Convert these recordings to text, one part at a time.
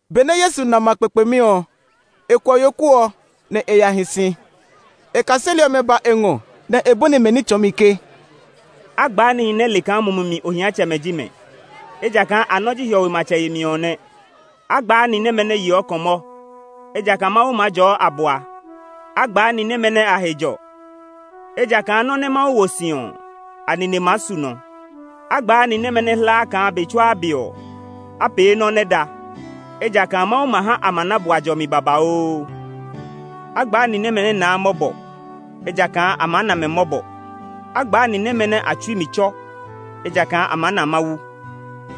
Benɛ Yesu na ma kpekpemi ɔ, e kuɔ yoku ɔ, nɛ e ya hi si. E kaseli ɔmɛ ba e ngɔ, nɛ e bɔni mɛ ní tsɔɔmi ke, “A gbaa nihi nɛ le kaa mumi mi ohiatsɛmɛ ji mɛ, ejakaa a nɔ́ ji hiɔwe matsɛ yemi ɔ nɛ. “A gbaa ni nɛmɛ nɛ yeɔ kɔmɔ, ejakaa Mawu maa jɔɔ a bua. “A gbaa ni nɛmɛ nɛ a he jɔ, ejakaa nɔ́ nɛ Mawu wo he si ɔ, a nine maa su nɔ. “A gbaa ni nɛmɛ nɛ hlaa kaa be tsuaa be ɔ, a pee nɔ́ nɛ da, ejakaa Mawu ma ha a ma na bua jɔmi babauu. “A gbaa ni nɛmɛ nɛ naa mɔbɔ, ejakaa a maa na mɛ mɔbɔ. “A gbaa ni nɛmɛ nɛ a tsui mi tsɔ, ejakaa a maa na Mawu.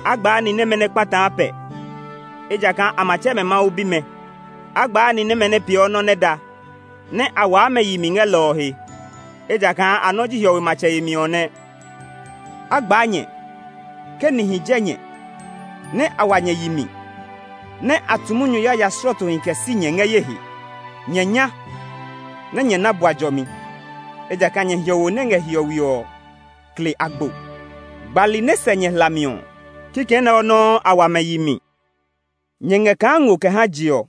“A gbaa ni nɛmɛ nɛ kpataa pɛ, ejakaa a ma tsɛ mɛ Mawu bimɛ. “A gbaa ni nɛmɛ nɛ peeɔ nɔ́ nɛ da, nɛ a waa mɛ yi mi ngɛ lɔ ɔ he, ejakaa a nɔ́ ji hiɔwe matsɛ yemi ɔ nɛ. “A gbaa nyɛ, ke nihi jɛ nyɛ, nɛ a wa nyɛ yi mi, nɛ a tu munyu yaya slɔɔtohi kɛ si nyɛ ngɛ ye he. Nyɛ nya, nɛ nyɛ na bua jɔmi, ejakaa nyɛ hiɔwo nɛ ngɛ hiɔwe ɔ kle agbo. Gbali nɛ sɛ nyɛ hlami ɔ, kikɛ nɛ ɔ nɔuu a wa mɛ yi mi. “Nyɛ ngɛ kaa ngo kɛ ha je ɔ.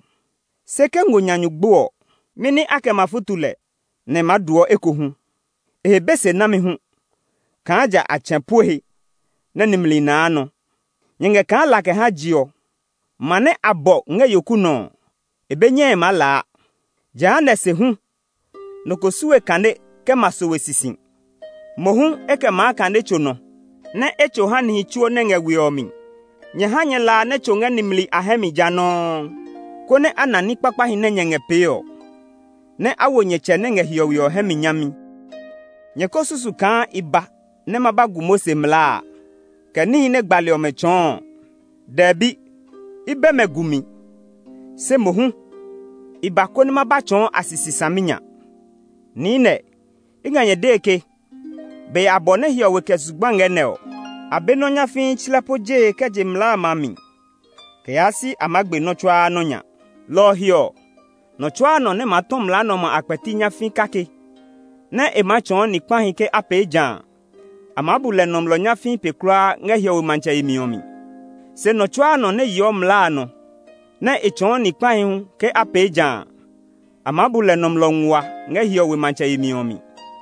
Se ke ngo nya nyu gbo ɔ, mɛni a kɛ ma futu lɛ, nɛ e maa dooɔ ekohu? E he be se nami hu kaa ja a tsɛ̃ pue he, nɛ nimli naa nɔ. “Nyɛ ngɛ kaa la kɛ ha je ɔ. Ma nɛ a bɔ ngɛ yoku nɔ ɔ, e be nyɛe maa laa. Jehanɛ se hu, nɔ ko su we kane kɛ ma sowe sisi; mohu e kɛ maa kane tso nɔ, nɛ́ e tso ha nihi tsuo nɛ ngɛ we ɔ mi. Nyɛ ha nyɛ la a nɛ tso ngɛ nimli a hɛ mi ja nɔuu, konɛ a na ní kpakpahi nɛ nyɛ ngɛ pee ɔ, nɛ a wo nyɛ Tsɛ nɛ ngɛ hiɔwe ɔ hɛ mi nyami. “Nyɛ ko susu kaa i ba nɛ ma ba gu Mose mlaa a, kɛ níhi nɛ gbali ɔmɛ tsɔɔ ɔ. Dɛbi! I bɛ mɛ gumi; se mohu, i ba, konɛ ma ba tsɔɔ a sisi saminya. Niinɛ, i ngɛ nyɛ dee ke, be abɔ nɛ hiɔwe kɛ zugba ngɛ nɛ ɔ, a be nɔ́ nyafii tslɛ po jee kɛ je mlaa a mi kɛ yaa si a maa gbe nɔ́ tsuaa nɔ́ nya. Lɔ ɔ he ɔ, nɔ tsua nɔ nɛ maa tɔ mlaa nɛ ɔmɛ a kpɛti nyafii kake, nɛ e maa tsɔɔ ni kpahi ke a pee ja a, a maa bu lɛ nɔmlɔ nyafii pe kulaa ngɛ hiɔwe matsɛ yemi ɔ mi. Se nɔ tsuaa nɔ nɛ yeɔ mlaa a nɔ, nɛ e tsɔɔ ni kpahi hu ke a pee ja a, a maa bu lɛ nɔmlɔ nguaa ngɛ hiɔwe matsɛ yemi ɔ mi.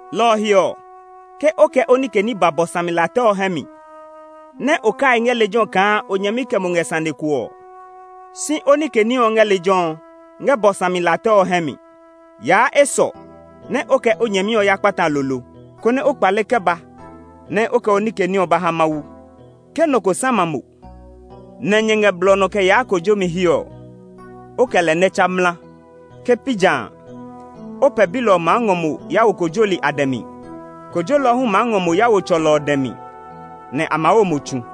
Lɔ ɔ he ɔ, ke o kɛ o nike ní ba bɔ sami la tɛ ɔ hɛ mi, nɛ o kai ngɛ lejɛ ɔ kaa o nyɛmi kɛ mo ngɛ sane ko ɔ, si o nike ní ɔ ngɛ lejɛ ɔ, ngɛ bɔ sami la tɛ ɔ hɛ mi. Yaa esɔ, nɛ o kɛ o nyɛmi ɔ ya kpata lolo, konɛ o kpale kɛ ba nɛ o kɛ o nike ní ɔ ba ha Mawu. “Ke nɔ ko sama mo, nɛ nyɛ ngɛ blɔ ɔ nɔ kɛ yaa kojomi he ɔ, o kɛ lɛ nɛ tsa mla. Ke pi ja a, o pɛbilɔ ɔ maa ngɔ mo ya wo kojolɔ ɔ dɛ mi; kojolɔ hu maa ngɔ mo ya wo tsɔlɔ ɔ dɛ mi, nɛ a maa wo mo tsu.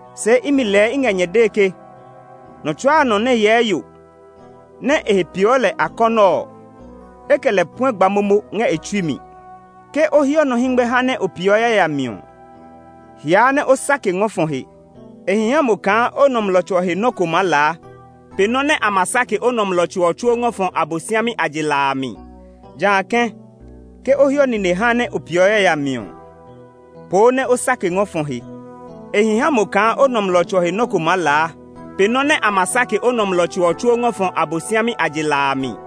Se imi lɛɛ i ngɛ nyɛ dee ke nɔ tsuaa nɔ nɛ hyɛɛ yo, nɛ e he peeɔ lɛ akɔnɔ ɔ, e kɛ lɛ puɛ gba momo ngɛ e tsui mi. Ke o hiɔ nɔ hɛngmɛ haa nɛ o peeɔ yayami ɔ, hiaa nɛ o sake ngɔ fɔ he. E hi ha mo kaa o nɔmlɔ tso ɔ he nɔ́ ko maa laa pe nɔ́ nɛ a ma sake o nɔmlɔ tso ɔ tsuo ngɔ fɔ Abosiami a je la a mi. Jã kɛ̃, ke o hiɔ nine haa nɛ o peeɔ yayami ɔ, poo nɛ o sake ngɔ fɔ he. E hi ha mo kaa o nɔmlɔ tso ɔ he nɔ́ ko maa laa pe nɔ́ nɛ a ma sake o nɔmlɔ tso ɔ tsuo ngɔ fɔ Abosiami a je la a mi.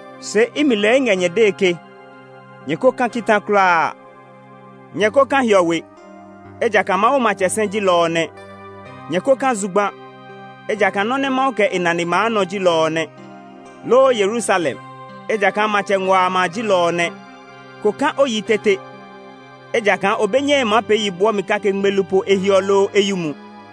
Se imi lɛɛ i ngɛ nyɛ dee ke nyɛ ko ka kita kulaa! Nyɛ ko ka hiɔwe, ejakaa Mawu matsɛ sɛ ji lɔ ɔ nɛ; nyɛ ko ka zugba, ejakaa nɔ́ nɛ Mawu kɛ e nane maa nɔ ji lɔ ɔ nɛ; loo Yerusalem, ejakaa Matsɛ ngua a ma ji lɔ ɔ nɛ. Ko ka o yi tete, ejakaa o be nyɛe maa pee yi bwɔmi ngmelu kake po ehiɔ loo eyumu.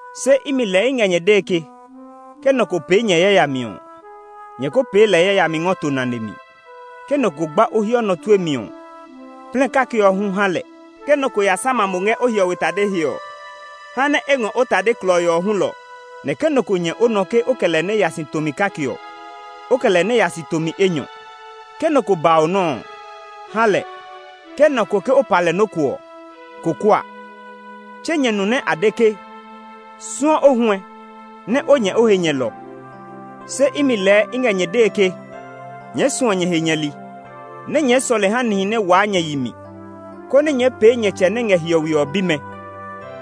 Se imi lɛɛ i ngɛ nyɛ dee ke ke nɔ ko pee nyɛ yayami ɔ, nyɛ ko pee lɛ yayami ngɔ to nane mi. Ke nɔ ko gba o hiɔ ɔ nɔ tue mi ɔ, plɛ kake ɔ hu ha lɛ. Ke nɔ ko ya sama mo ngɛ o hiɔwe tade he ɔ, ha nɛ e ngɔ o tade klɔii ɔ hulɔ. Nɛ ke nɔ ko nyɛ o nɔ ke o kɛ lɛ nɛ ya si tomi kake ɔ, o kɛ lɛ nɛ ya si tomi enyɔ. Ke nɔ ko ba mo nɔ́ ɔ, ha lɛ; ke nɔ ko ke o pa lɛ nɔ́ ko ɔ, ko kua. “Tse nyɛ nu nɛ a de ke, ‘Suɔ o huɛ, nɛ o nyɛ o he nyɛlɔ.’ Se imi lɛɛ i ngɛ nyɛ dee ke nyɛɛ suɔ nyɛ he nyɛli, nɛ nyɛɛ sɔle ha nihi nɛ waa nyɛ yi mi, konɛ nyɛɛ pee nyɛ Tsɛ nɛ ngɛ hiɔwe ɔ bimɛ.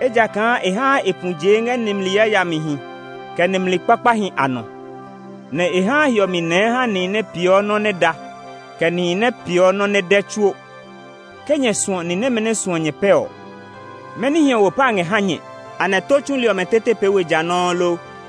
Ejakaa e haa e pu ɔ jee ngɛ nimli yayamihi, kɛ nimli kpakpahi a nɔ; nɛ e haa hiɔmi nɛɛ ha nihi nɛ peeɔ nɔ́ nɛ da, kɛ nihi nɛ peeɔ nɔ nɛ dɛ tsuo. Ke nyɛ suɔ ni nɛmɛ nɛ suɔ nyɛ ɔ pɛ ɔ, mɛni hiɔwo pa ngɛ ha nyɛ? Anɛ tó tsuli ɔmɛ tete pee we ja nɔuu lo?